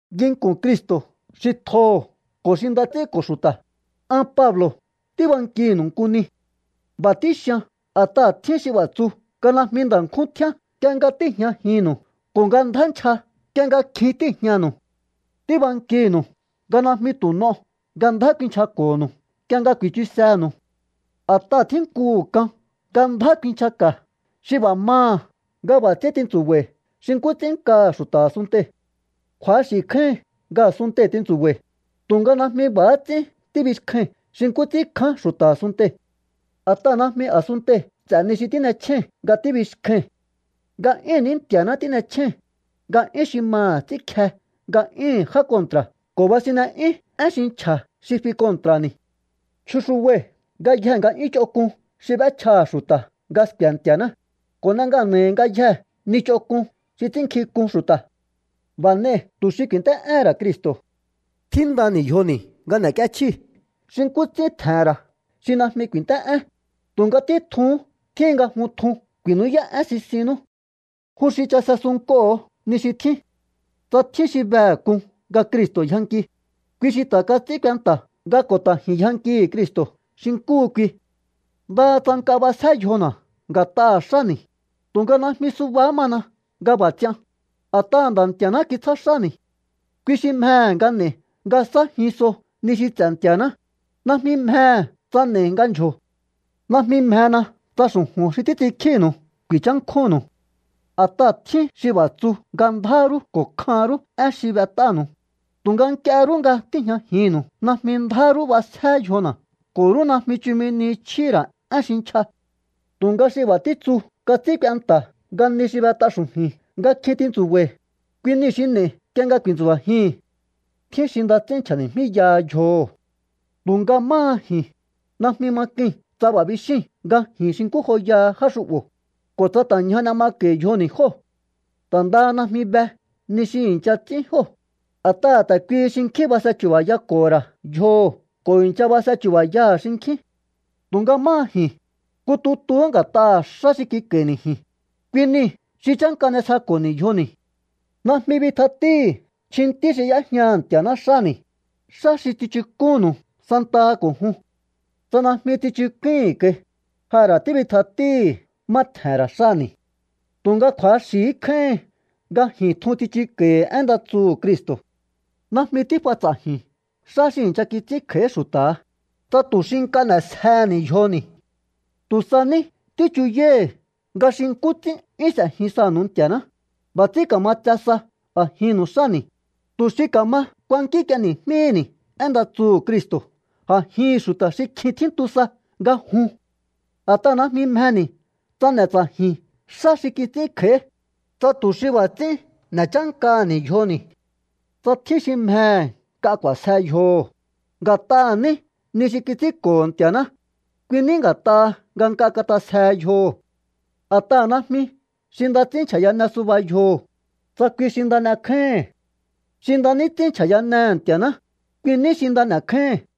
Nginku̱n Cristo̱ xi tjoho̱ ko̱ xi nda ts'ínko̱ xu̱ta̱, an Pablo̱ tíbankinu̱u nku ni. B'a̱ tíxian a̱t'aha̱ tjín xi b'a̱ tsu nga najmi nda̱ nkjún tjíán nk'ie nga tíi̱jñajinnu̱u ko̱ nga ndjá nchja nk'ie nga kjin tíi̱jñanu̱u. Tíbankinu̱u nga najmi tu̱ n'o nga ndjá kuinchjako̱nu̱u nk'ie nga ku̱i̱chusenu̱u. A̱t'aha̱ tjínnkuhu̱ k'an nga ndjá kuinchjaka̱ xi b'a̱ maha̱ nga b'a̱ ts'ín tintsu̱ba̱i̱ xi nkú ts'ín nkaha̱ xu̱ta̱ a̱sunntei̱. Kju̱axi̱ kjáíhin nga a̱sunntei̱ tintsu̱ba̱i̱, tu̱nga najmi b'a̱há ts'ín tíbixkjai̱n xi nkú ts'ín kján xu̱ta̱ a̱sunntei̱. A̱t'aha̱ najmi a̱sunntei̱ ts'e̱ ni xi tín'echjéi̱n nga tíbixkjai̱n. Nga'yúhu̱n ní Nti̱a̱ná tín'echjéi̱n, nga'yún xi maha̱ ts'ínkje nga'yúhu̱n já kontra̱ ko̱ basinne'yún én xi nchja̱ xi fi kontra̱ni̱. Chjuxubai̱ ngayjee̱ nga'yún ch'onk'un xi b'échjaha̱ xu̱ta̱ nga sku̱e̱ Nti̱a̱ná, ko̱ n'e ngana̱i̱hi̱ ngayjee̱ ni ch'onk'un xi ts'ínnkjink'un xu̱ta̱. B'a̱ n'ei̱ tu̱ xi ku̱i̱nt'é'éhe̱n ra̱ Cristo̱. Tjíndani̱ yjoni̱ nga n'e̱k'íéchjíi̱ xi nkú ts'ín tje̱he̱n ra̱ xi najmi ku̱i̱nt'é'én, tu̱nga títjuhún tjíhin nga jun tjun ku̱i̱nú'yá'én sisinnú. Jun xi chase sunnk'oho̱o ni xi tjín. Tsa tjín xi behe̱ k'un nga Cristo̱ yjanki, kui xi ta̱ kats'ín kuenta̱ nga ko̱ ta̱ ji̱n yjankii̱ Cristo̱ xi nkúhu kui. Ndaha tsa nk'a b'asjé yjona̱ nga̱t'aha̱ xáni̱, tu̱nga najmi subahá mana nga b'a̱ ts'ian, a̱t'aha̱ Nda̱ Nti̱a̱ná kitsjá xáni̱. Kui xi mjehe̱ nga n'e̱i̱ nga sa̱ájin so ni xi ts'e̱ Nti̱a̱ná, najmi mjehe̱ tsa n'e̱i̱ nga ndyjo̱o. Najmi mjena tsa xu̱ju̱n xi títs'inkjínu̱u ku̱i̱nchánkjúnnu̱u. A̱t'aha̱ tjín xi b'a̱ tsu nga ndjá rú ko̱ kjan rú én xi b'et'ánu̱u, tu̱nga nk'ie rú nga tíi̱jñajinnu̱u najmi ndjá rú b'asjé yjona̱ ko̱ rú najmi chumi ni chjíhi̱ ra̱ én xi nchja. Tu̱nga xi b'a̱ títsuu̱ kats'ín kuenta̱ nga ni xi b'et'a xu̱ju̱i̱n nga kjin tintsu̱ba̱i̱, kui niu̱ xi n'e̱i̱ nk'ie nga ku̱i̱ntsu̱ba̱jii̱hi̱n. Tjín xi nda ts'ín nchja̱ni̱jmíyaha yjoho̱. Tu̱nga máha ji̱n, najmi ma k'ui̱n tsa b'a̱ bixíi̱n nga ji̱n xi nkú joyaha já xu'bo̱, ko̱ tsa ta̱ ñja n'e mako̱i̱ yjoni̱ jóo̱. Ta̱ ndaha najmi be ni xi i̱ncha ts'ín jóo̱, a̱t'aha̱ ta̱ kuihi xinkjín base chu̱ba̱yako̱ho̱ ra̱ yjoho̱ ko̱ i̱ncha base chu̱ba̱yaha̱ xinkjín. Tu̱nga máha ji̱n, nku tutuhú nga̱t'aha̱ xá xi kik'a̱i̱ni̱ ji̱n, kui niu̱ xi chánka n'esjeko̱ho̱ni̱ yjoni̱. Najmi bitjatíi̱hi̱ chjintí xi y'éjñaha̱ Nti̱a̱ná xáni̱, xá xi tsichuk'únnu̱u santaha ko̱ jun. Tsa najmi tsichuk'úi̱hi̱n kai, ja ra̱ tíbitjatíi̱hi̱ má tje̱he̱n ra̱ xáni̱. Tu̱nga kju̱axi̱hí kjáíhin nga ji̱n tjun tsichuko̱i̱hi̱ én nda tsuhu̱ Cristo̱. Najmi tíf'a ts'a̱ji̱n xá xi i̱ncha kits'ín kj'a̱í xu̱ta̱ha, tsa tu̱ xi nk'a n'e̱sjehe̱ni̱ yjoni̱. Tu̱ sa ní tíchuyái̱hi̱ nga xi nkú ts'ín 'yún s'e̱jin sanu̱u Nti̱a̱ná, b'a̱ ts'ín ka̱ma tse sa a̱jinnu̱u xáni̱, tu̱ xi ka̱ma ku̱a̱nkínk'íéni̱jmíhi̱ni̱ én nda tsuhu̱ Cristo̱ a̱jihi̱n xu̱ta̱ xi kjin tjíntu sa nga jun. A̱t'aha̱ najmi mjeni̱ tsa n'e̱ ts'a̱ji̱n xá xi kits'ín kj'a̱í, tsa tu̱ xi b'a̱ ts'ín n'e̱ chánkaha̱ni̱ yjoni̱. Tsa tjín xi mjehe̱ nk'a k'u̱a̱sje yjoho̱, nga̱t'aha̱ ní ni xi kits'ínko̱ho̱ Nti̱a̱ná, kui ní nga̱t'aha̱ nga nk'a kat'asjehe yjoho̱. A̱t'aha̱ najmi xi nda ts'ín nchja̱yane suba yjoho̱, tsa kui xi nda n'ekjáíhi̱n. Xi nda ní ts'ín nchja̱yanehe̱ Nti̱a̱ná, kui ní xi nda n'e̱kjáíhi̱n.